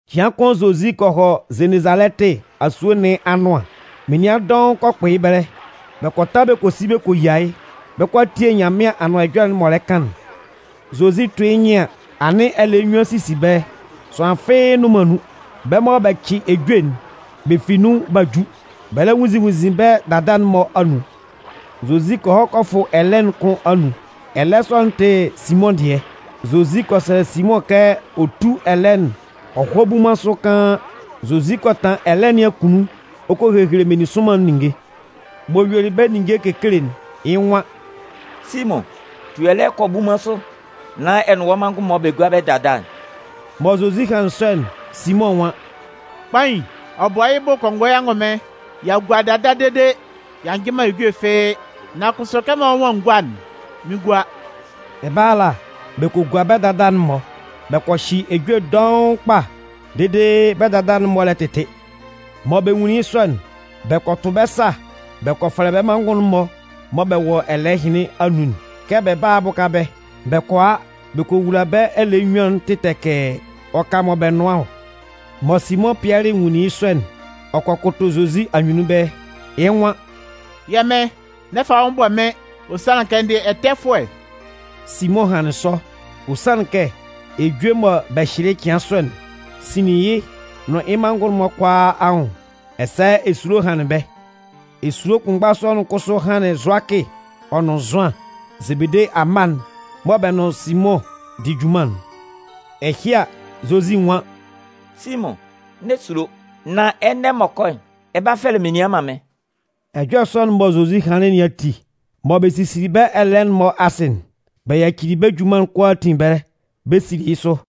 Cɩan kʋn Zozi kɔ hɔ Zenezalɛtɩ asue nɩn anʋan, menian dɔʋn kɔ kpʋ yɩ́ ɛbɛlɛ, bɛ kɔ ta kɔ si kɔ yia yɩ́, bɛ 'kɔ a tie Nyanmɩan Anʋan Ɛjɔlɛ'n m'ɔ lɛ kan'n. Zozi 'tʋ yɩ́ nyɩn an, anɩn ɛlɛɛ nnyuan sisi ɛbɛlɛ, sʋanlan fɩ́ɩ́ nnʋn man nun. Bɛ́ mɔ bɛ cɩ ejue'n, bɛ fi nun b'a ju, bɛ lɛ nwunnzin nwunnzin bɛ́ dada'n-mɔ anun. Zozi kɔ hɔ kɔ fʋ ɛlɛɛ'n kʋn anun. Ɛlɛɛ sɔ'n tɩ Simʋn dɩɛ. Zozi kɔ sɛlɛ Simʋn kɛ ɔ tú ɛlɛɛ'n ɔ hɔ́ bunman sʋ kaan. Zozi kɔ tanlan ɛlɛɛ nɩn akunnun ɔ kɔ hehele meninsʋnman'n ninnge. M'ɔ yuelɩ bɛ́ ninnge kekele'n, yɩ́ nwan: “Simʋn, tu ɛlɛɛ'n kɔ bunman sʋ nán ɛ nʋn wɔ́ manngʋn'n-mɔ bɛ gúa bɛ́ dada'n.” Mɔ Zozi hanlɩn sɔ'n, Simʋn nwan: “Kpain, ɔ bɔ yɩ́ bʋ kɔngɔɛ angʋnmɩn, y'a gua dada dede y'a njɩ man ejue fɩ́ɩ́. Nan kʋsʋ kɛmɔ wɔ́ nwan n gúa'n, mɩn 'gua.” Ɛbɛlɛ ala, bɛ kɔ gua bɛ́ dada'n-mɔ. Bɛ kɔ hyɩ ejue dɔʋn kpa dede bɛ́ dada'n-mɔ lɛ tɩtɩ. Mɔ bɛ nwunlin yɩ́ sɔ'n, bɛ kɔ tʋ bɛ́ sa bɛ kɔ fɛlɛ bɛ́ manngʋn'n-mɔ mɔ bɛ wɔ ɛlɛɛ ɛhɩnlɩn anun'n kɛ bɛ bála a bʋka bɛ́. Bɛ kɔ a bɛ kɔ wula bɛ́ ɛlɛɛ nnyuan'n tɩtɛkɛɛ, ɔ ka mɔ bɛ nʋan ɔ. Mɔ Simʋn Pɩɛlɩ nwunlin yɩ́ sɔ'n, ɔ kɔ kʋtʋ Zozi anyunnun ɛbɛlɛ, yɩ́ nwan: “Yɛ́ Mɩn, n'ɛ fa wɔ́ nwʋn bɔ mɩ́n. Ɔ sanlɩn kɛ n dɩ ɛtɛfʋɛ.” Simʋn hanlɩn sɔ, ɔ sanlɩn kɛ ejue mɔ bɛ hyɩlɩ yɩ́ cɩan sɔ'n sinlin yɩ́ nʋn yɩ́ manngʋn'n-mɔ kʋalaa anwʋn, ɛsɛ esulo hanlɩn bɛ́. Esulo kʋnmgba sɔ'n kʋsʋ hanlɩn Zʋakɩ ɔ nʋn Zʋan, Zebede amma'n mɔ bɛ nʋn Simʋn di junman'n. Ɛhɩ a, Zozi nwan: “Simʋn, n'ɛ sulo! Nan ɛnɛ m'ɔ kɔ'n, ɛ 'ba fɛfɛlɛ menian man mɩ́n.” Ɛjɔlɛ sɔ'n mɔ Zozi hanlɩn nɩn ati, mɔ bɛ sisili bɛ́ ɛlɛɛ'n-mɔ asɩ'n, bɛ yacili bɛ́ junman'n kʋalaatin ɛbɛlɛ, bɛ sili yɩ́ sʋ.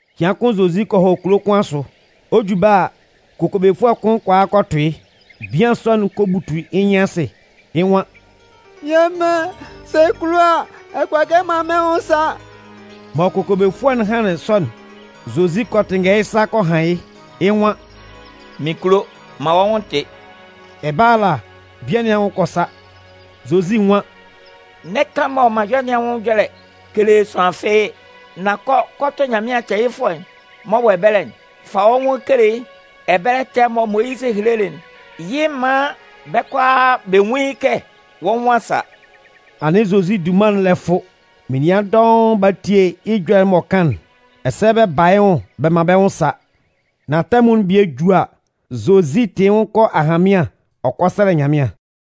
Cɩan kʋn Zozi kɔ hɔ kulo kʋn asʋ. Ɔ ju ɛbɛlɛ ala, kokobefʋɛ kʋn kɔ a kɔ tʋ yɩ́. Bian sɔ'n kɔ butu yɩ́ nyɩn asɩ yɩ́ nwan: “Yɛ́ Mɩn, sɛ ɛ kulo a, ɛ kʋala kɛ ɛ man mɩ́n nwʋn sa.” Mɔ kokobefʋɛ'n hanlɩn sɔ'n, Zozi kɔ tɩnngɛ yɩ́ sa kɔ han yɩ́, yɩ́ nwan: “Mɩn kulo, man wɔ́ nwʋn tɩ́!” Ɛbɛlɛ ala, bian nɩn anwʋn kɔ sa. Zozi nwan: “N'ɛ kan mɔ m'an yɔ nɩn anwʋn ɛjɔlɛ kele sʋanlan fɩ́ɩ́. Nan kɔ kɔ tʋ Nyanmɩan tɛɛyɩfʋɛ'n m'ɔ wɔ ɛbɛlɛ'n, fa wɔ́ nwʋn'n kele yɩ́. Ɛbɛlɛ tɛɛ'n mɔ Moyizɩ helelɩ'n, yɩ maan bɛ́ kʋalaa bɛ nwun yɩ́ kɛ wɔ́ nwʋn a sa.” Anɩn Zozi dunman'n lɛ fʋ. Menian dɔʋn ba tie yɩ́ ɛjɔlɛ'n m'ɔ kan'n, ɛsɛ bɛ ba yɩ́ nwʋn bɛ man bɛ́ nwʋn sa. Nan tɛmʋn'n bie ju a, Zozi tɩ yɩ́ nwʋn kɔ ahanmɩan ɔ kɔ sɛlɛ Nyanmɩan.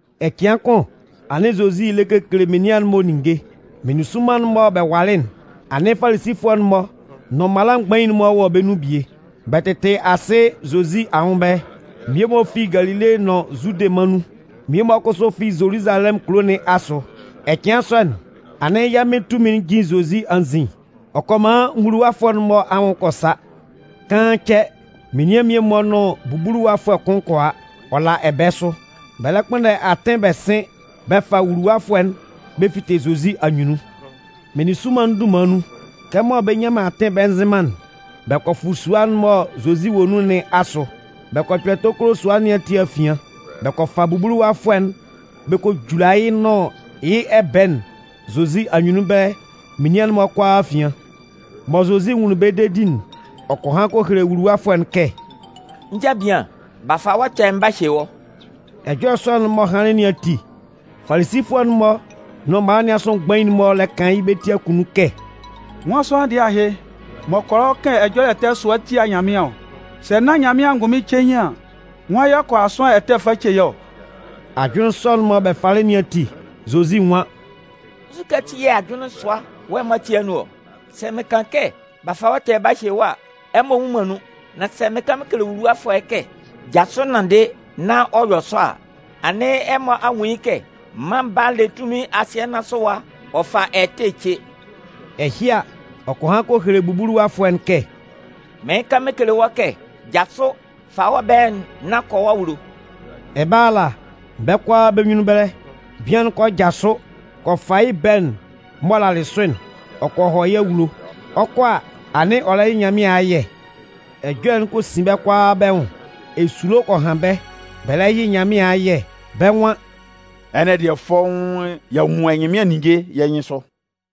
Ɛcɩan kʋn anɩn Zozi lɛ kekele menian'n-mɔ ninnge. Meninsʋnman'n mɔ bɛ walɩ'n, anɩn Falisifʋɛ'n-mɔ nʋn mala mgbain'n-mɔ wɔ bɛ́ nun bie. Bɛ tɩtɩ asɩ Zozi anwʋn ɛbɛlɛ. Mmie-mɔ fi Galile nʋn Zude mân nun, mmie kʋsʋ fi Zoluzalɛmʋn kulo nɩn asʋ. Ɛcɩan sɔ'n, anɩn yɛ́ Mɩn tunmin'n jin Zozi anzin ɔ kɔ man nwuluwafʋɛ'n-mɔ anwʋn kɔ sa. Kaan cɛ, menian mmie-mɔ nʋn bubuluwafʋɛ kʋn kɔ a, ɔ la ɛbɛɛ sʋ. Bɛ lɛ kpʋnndɛ atɩn bɛ sɩn bɛ fa wuluwafʋɛ'n bɛ fite Zozi anyunnun. Meninsʋnman'n dunman nun, kɛmɔ bɛ nnyan man atɩn bɛ nzɩn man'n, bɛ kɔ fʋ sua'n mɔ Zozi wɔ nun nɩn asʋ. Bɛ kɔ kpɛ tokolo sua nɩn ati afian, bɛ kɔ fa bubuluwafʋɛ'n bɛ kɔ jula yɩ́ nʋn yɩ́ ɛbɛɛ'n Zozi anyunnun ɛbɛlɛ menian'n-mɔ kʋalaa afian. Mɔ Zozi nwunlin bɛ́ dedi'n, ɔ kɔ han kɔ hele wuluwafʋɛ'n kɛ: “Njabian, b'a fa wɔ́ ɛtɛ'n b'a hye wɔ́.” Ɛjɔlɛ sɔ'n m'ɔ hanlɩn nɩn ati, Falisifʋɛ'n-mɔ nʋn mala nɩn asʋ mgbain'n-mɔ lɛ kan yɩ́ bɛ́ ti akunnun kɛ: “Nwan sʋanlan dɩɛ ahɩ m'ɔ kʋala ɔ kan ɛjɔlɛ ɛtɛ sʋa tia Nyanmɩan ɔ? Sɛ nán Nyanmɩan angʋnmɩn cein an, nwan y'ɔ kʋala sʋanlan ɛtɛ fa ce yɩ́ ɔ?” Ajʋnlɩn sɔ'n mɔ bɛ falɩ nɩn ati, Zozi nwan: “Nzukɛ ati yɛ̂ ajʋnlɩn sʋa-mɔ wɔ ɛmɔ ati anun ɔ? Sɛ mɩn kan kɛ: ‘B'a fa wɔ́ ɛtɛ'n b'a hye wɔ́’ a, ɛmɔ nnwun man nun. Nan sɛ mɩn kan mɩn kele wuluwafʋɛ'n kɛ: ‘Jasʋ nanndɩ’ nán ɔ yɔ sɔ a, anɩn ɛmɔ a nwun yɩ́ kɛ Mân Baa'n le tunmin asɩɛ nɩn asʋ ɛwa ɔ fa ɛtɛ ce.” Ɛhɩ a, ɔ kɔ han kɔ hele bubuluwafʋɛ'n kɛ: “Mɩɩn kan mɩn kele wɔ́, jasʋ, fa wɔ́ ɛbɛɛ'n nán kɔ wɔ́ awulo!” Ɛbɛlɛ ala, bɛ́ kʋalaa bɛ́ nyunnun ɛbɛlɛ, bian'n kɔ jasʋ kɔ fa yɩ́ ɛbɛɛ'n m'ɔ lalɩ sʋ'n, ɔ kɔ hɔ yɩ́ awulo. Ɔ 'kɔ a, anɩn ɔ lɛ yɩ Nyanmɩan ayɛ. Ɛjɔlɛ'n kɔ sin bɛ́ kʋalaa bɛ́ nwʋn. Esulo kɔ han bɛ́, bɛ lɛ yɩ Nyanmɩan ayɛ, bɛ́ nwan: “Ɛnɛ dɩɛ, fɔ́ʋ́n y'a nwun ɛnyɩnmɩan ninnge yɛ́ nyɩnsʋ!”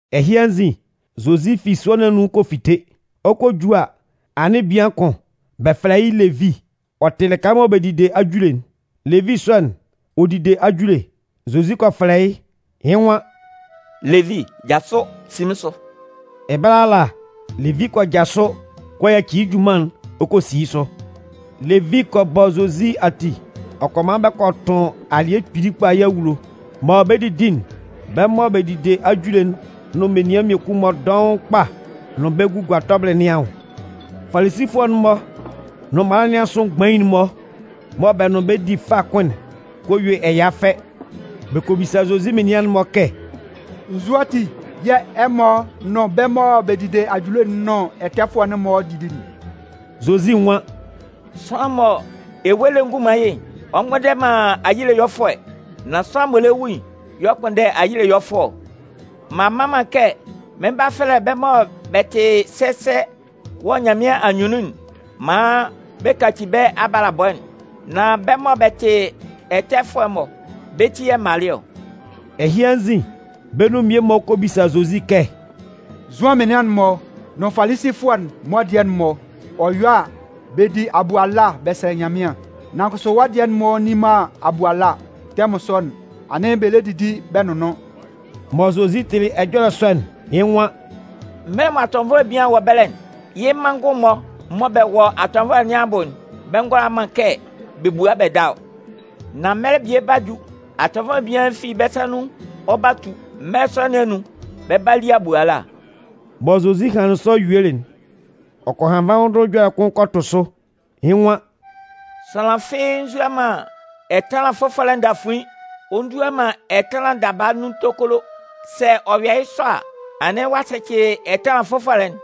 Ɛhɩ anzin, Zozi fi sua nɩn anun kɔ fite. Ɔ 'kɔ ju a, anɩn bian kʋn, bɛ fɛlɛ yɩ́ Levi, ɔ tɩ lɩka mɔ bɛ didi ajule'n. Levi sɔ'n, ɔ dide ajule. Zozi kɔ fɛlɛ yɩ́, yɩ́ nwan: “Levi, jasʋ, si mɩ́n sʋ!” Ɛbɛlɛ ala, Levi kɔ jasʋ kɔ yaci yɩ́ junman'n ɔ kɔ si yɩ́ sʋ. Levi kɔ bɔ Zozi ati ɔ kɔ man bɛ kɔ tʋn alɩɛ kpili kpa yɩ́ awulo. Mɔ bɛ 'didi'n, bɛ́ mɔ bɛ dide ajule'n nʋn menian mmiekun-mɔ dɔʋn kpa nʋn bɛ́ gugua tɔbɩlɩ nɩn anwʋn. Falisifʋɛ'n-mɔ nʋn mala nɩn asʋ mgbain'n-mɔ mɔ bɛ nʋn bɛ́ di fâ kʋn'n kɔ yue ɛya fɛ. Bɛ kɔ bisa Zozi menian'n-mɔ kɛ: “Nzu ati yɛ̂ ɛmɔ nʋn bɛ́ mɔ bɛ dide ajule'n nʋn ɛtɛfʋɛ'n-mɔ didi'n?” Zozi nwan: “Sʋanlan mɔ ewue lɛ ngun man yɩ́'n, ɔ mgbʋnndɛ man ayile ɛyɔlɛfʋɛ. Nan sʋanlan m'ɔ lɛ wu'n y'ɔ kpʋnndɛ ayile ɛyɔlɛfʋɛ ɔ. M'an mma man kɛ mɩn 'ba fɛlɛ bɛ́ mɔ bɛ tɩ sɛsɛ wɔ Nyanmɩan anyunnun'n maan bɛ kaci bɛ́ abalabɔ'n. Nan bɛ́ mɔ bɛ tɩ ɛtɛfʋɛ'n-mɔ, bɛ́ ti yɛ̂ m malɩ ɔ.” Ɛhɩ anzin, bɛ́ nun mmie-mɔ kɔ bisa Zozi kɛ: “Zʋan menian'n-mɔ nʋn Falisifʋɛ'n-mɔ dɩɛ'n-mɔ, ɔ yɔ a, bɛ di abuala bɛ sɛlɛ Nyanmɩan. Nan kʋsʋ wɔ́ dɩɛ'n-mɔ nni man abuala, tɛmʋn sɔ'n, anɩn bɛ lɛ didi bɛ nʋnnʋn.” Mɔ Zozi tɩlɩ ɛjɔlɛ sɔ'n, yɩ́ nwan: “Mɛlɛ mɔ atɔnvɔlɛ bian'n wɔ ɛbɛlɛ'n, yɩ́ manngʋn'n-mɔ mɔ bɛ wɔ atɔnvɔlɛ nɩn abʋ'n, bɛ ngʋala man kɛ bɛ bua bɛ da ɔ. Nan mɛlɛ bie 'ba ju, atɔnvɔlɛ bian'n fi bɛ́ sa nun ɔ 'ba tu. Mɛlɛ sɔ nɩn anun, bɛ 'ba li abuala.” Mɔ Zozi hanlɩn sɔ yuelɩ'n, ɔ kɔ han nvandʋhʋn ɛjɔlɛ kʋn kɔ tʋ sʋ, yɩ́ nwan: “Sʋanlan fɩ́ɩ́ nzua man ɛtanlan fʋfɔlɛ ndafuin ɔ ndua man ɛtanlan daba nun tokolo. Sɛ ɔ yɔ yɩ́ sɔ a, anɩn ɔ'a sɛcɩ ɛtanlan fʋfɔlɛ'n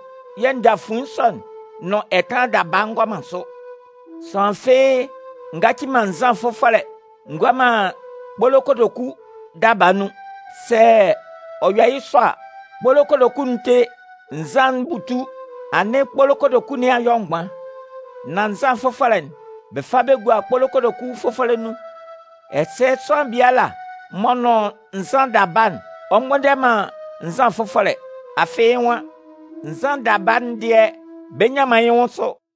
yɛ̂ ndafuin sɔ'n nʋn ɛtanlan daba ngɔ man sʋ. Sʋanlan fɩ́ɩ́ ngaci man nzan fʋfɔlɛ ngua man kpolo kotoku daba nun. Sɛ ɔ yɔ yɩ́ sɔ a, kpolo kotoku'n 'te, nzan'n 'butu, anɩn kpolo kotoku nɩn a yɔ mgban. Nan nzan fʋfɔlɛ'n, bɛ fa bɛ gua kpolo kotoku fʋfɔlɛ nun. Ɛsɛ sʋanlan biala m'ɔ nʋn nzan daba'n, ɔ mgbʋnndɛ man nzan fʋfɔlɛ. Afɩ yɩ́ nwan: ‘Nzan daba'n dɩɛ bɛ nnyan man yɩ́ nwʋn sʋ.’”